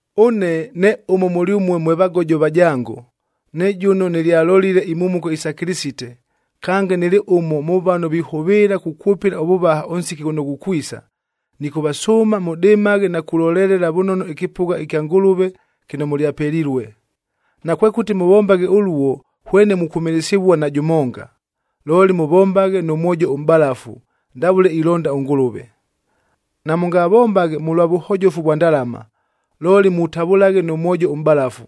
Ʉne ne ʉmo mʉlyʉmue mwe vagojoa vajango, ne jʉno nɨlyalolile imhumuko isa Kɨlɨsite, kange nɨlɨ ʉmo mʉ vano vihʉvɨɨla kukwʉpɨla ʉvʉvaha ʉnsiki ghʉno ghukwisa, nɨkʉvasʉʉma mʉdɨmaghe na kulolelela vʉnono ɨkɨpʉgha kya Ngʉlʉve kɨno mʉlyapelilue. Nakwekʉti mʉvombaghe ʉluo hwene mukwʉmɨlɨsɨvua na jʉmonga, looli mʉvombaghe nʉ mwojo ʉmʼbalafu ndavʉle ilonda ʉNgʉlʉve. Namʉngavombaghe mʉlwa vʉhojofu vwa ndalama, looli mutavʉlaghe nʉ mwojo ʉmʼbalafu.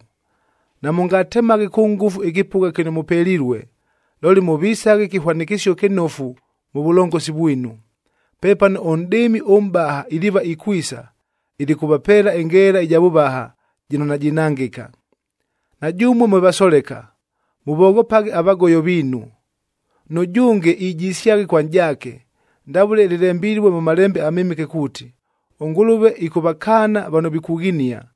Namʉngatemaghe kʉ ngʉfu ɨkɨpʉgha kɨno mʉpelilue, looli mʉvisaghe kɨhwanɨkɨsio kɨnofu mʉ vʉlongosi vwinu. Pepano ʉNʼdɨɨmi ʉMʼbaha iliiva ikwisa, ilikʉvapeela ɨngeela ɨja vʉvaha, jɨno najinangɨka. Na jʉmue mwe vasoleka, mʉvoghopaghe avagoyo viinu. Nʉjʉnge ijisyaghe kwa nʼjaake. Ndavʉle lɨlembilue mʉ Malembe aMɨmɨke kuuti, “ɄNgʉlʉve ɨkʉvakaana vano vikughinia,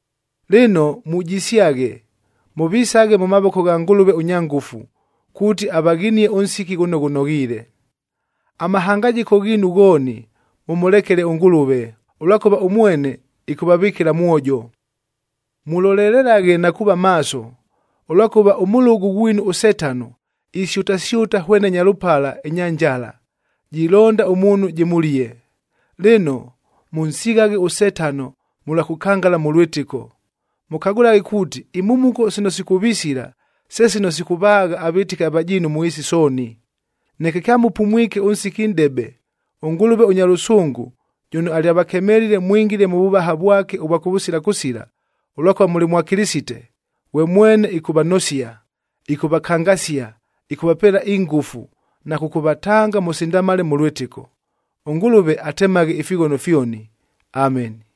Lɨno mujisyaghe, mʉvisaghe mʉ mavoko gha Ngʉlʉve ʉnya ngʉfu, kuuti avaghinie ʉnsiki ghʉno ghʉnoghiile. Amahangajɨko ghiinu ghooni mʉmʉlekele ʉNgʉlʉve, ʉlwakʉva ʉmwene ɨkʉvavɨkɨla mwojo. Mulolelelaghe na kuuva maaso, ʉlwakʉva ʉmʉlʉgʉ ghwinu ʉSetano isyʉtasyʉta hwene nyalʉpala ɨnya njala, jilonda ʉmuunhu jɨmʉlie. Lɨno, mʉnsighaghe ʉSetano mʉlwa kʉkangala mʉ lwɨtɨko. Mʉkagʉlaghe kuuti imhumuko sino sikʉvisila, se sino sikʉvaagha avɨtɨki avajiinu mʉ ɨɨsi sooni. Neke kyamʉpumwike ʉnsiki nʼdebe, ʉNgʉlʉve ʉnya lʉsʉngʉ, jʉno alyavakemelile mwingile mʉ vʉvaha vwake ʉvwa kʉvʉsila kʉsila ʉlwakʉva mʉlɨ mwa Kɨlɨsite, ghwe mwene ɨkʉvanosia, ɨkʉvakangasia, ɨkʉvapeela ingʉfu na kʉkʉvatanga mʉsindamale mʉ lwɨtɨko. ɄNgʉlʉve atemaghe ifighono fyoni. Ameni.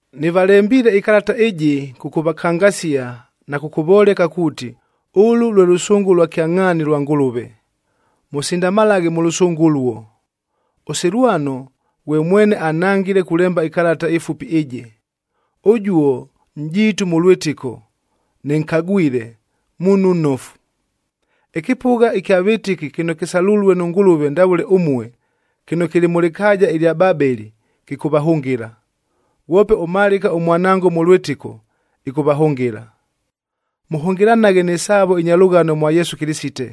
Nɨvalembiile ɨkalata ɨjɨ kʉkʉvakangasia na kʉkʉvoleka kuuti, ʉlʉ lwe lʉsʉngʉ lwa kyangʼhaani lwa Ngʉlʉve. Mʉsindamalaghe mʉ lʉsʉngʉ ʉluo. ɄSilwano,c ghwe mwene anhangile kulemba ɨkalata ɨfupi ɨjɨ. Ʉjuo, nʼjiitu mʉ lwɨtɨko, nɨnkagwile, muunhu nnofu. Ɨkɨpʉgha ɨkya vɨtɨki kɨno kɨsalulue nʉ Ngʉlʉve ndavʉle ʉmue, kɨno kɨlɨ mʉ lɨkaaja ɨlya Babeli,d kɨkʉvahʉngɨla. Ghwope ʉMalɨka ʉmwanango mʉ lwɨtɨko, ɨkʉvahʉngɨla. Mʉhʉngɨlanaghe nɨ saavo ɨnya lʉghano mwa Yesu Kɨlɨsite.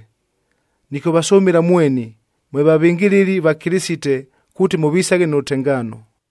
Nɨkʉvasʉmɨla mweni, mwe vavɨngɨlɨli va Kɨlɨsite kuuti mʉvisaghe nʉ lʉtengaano.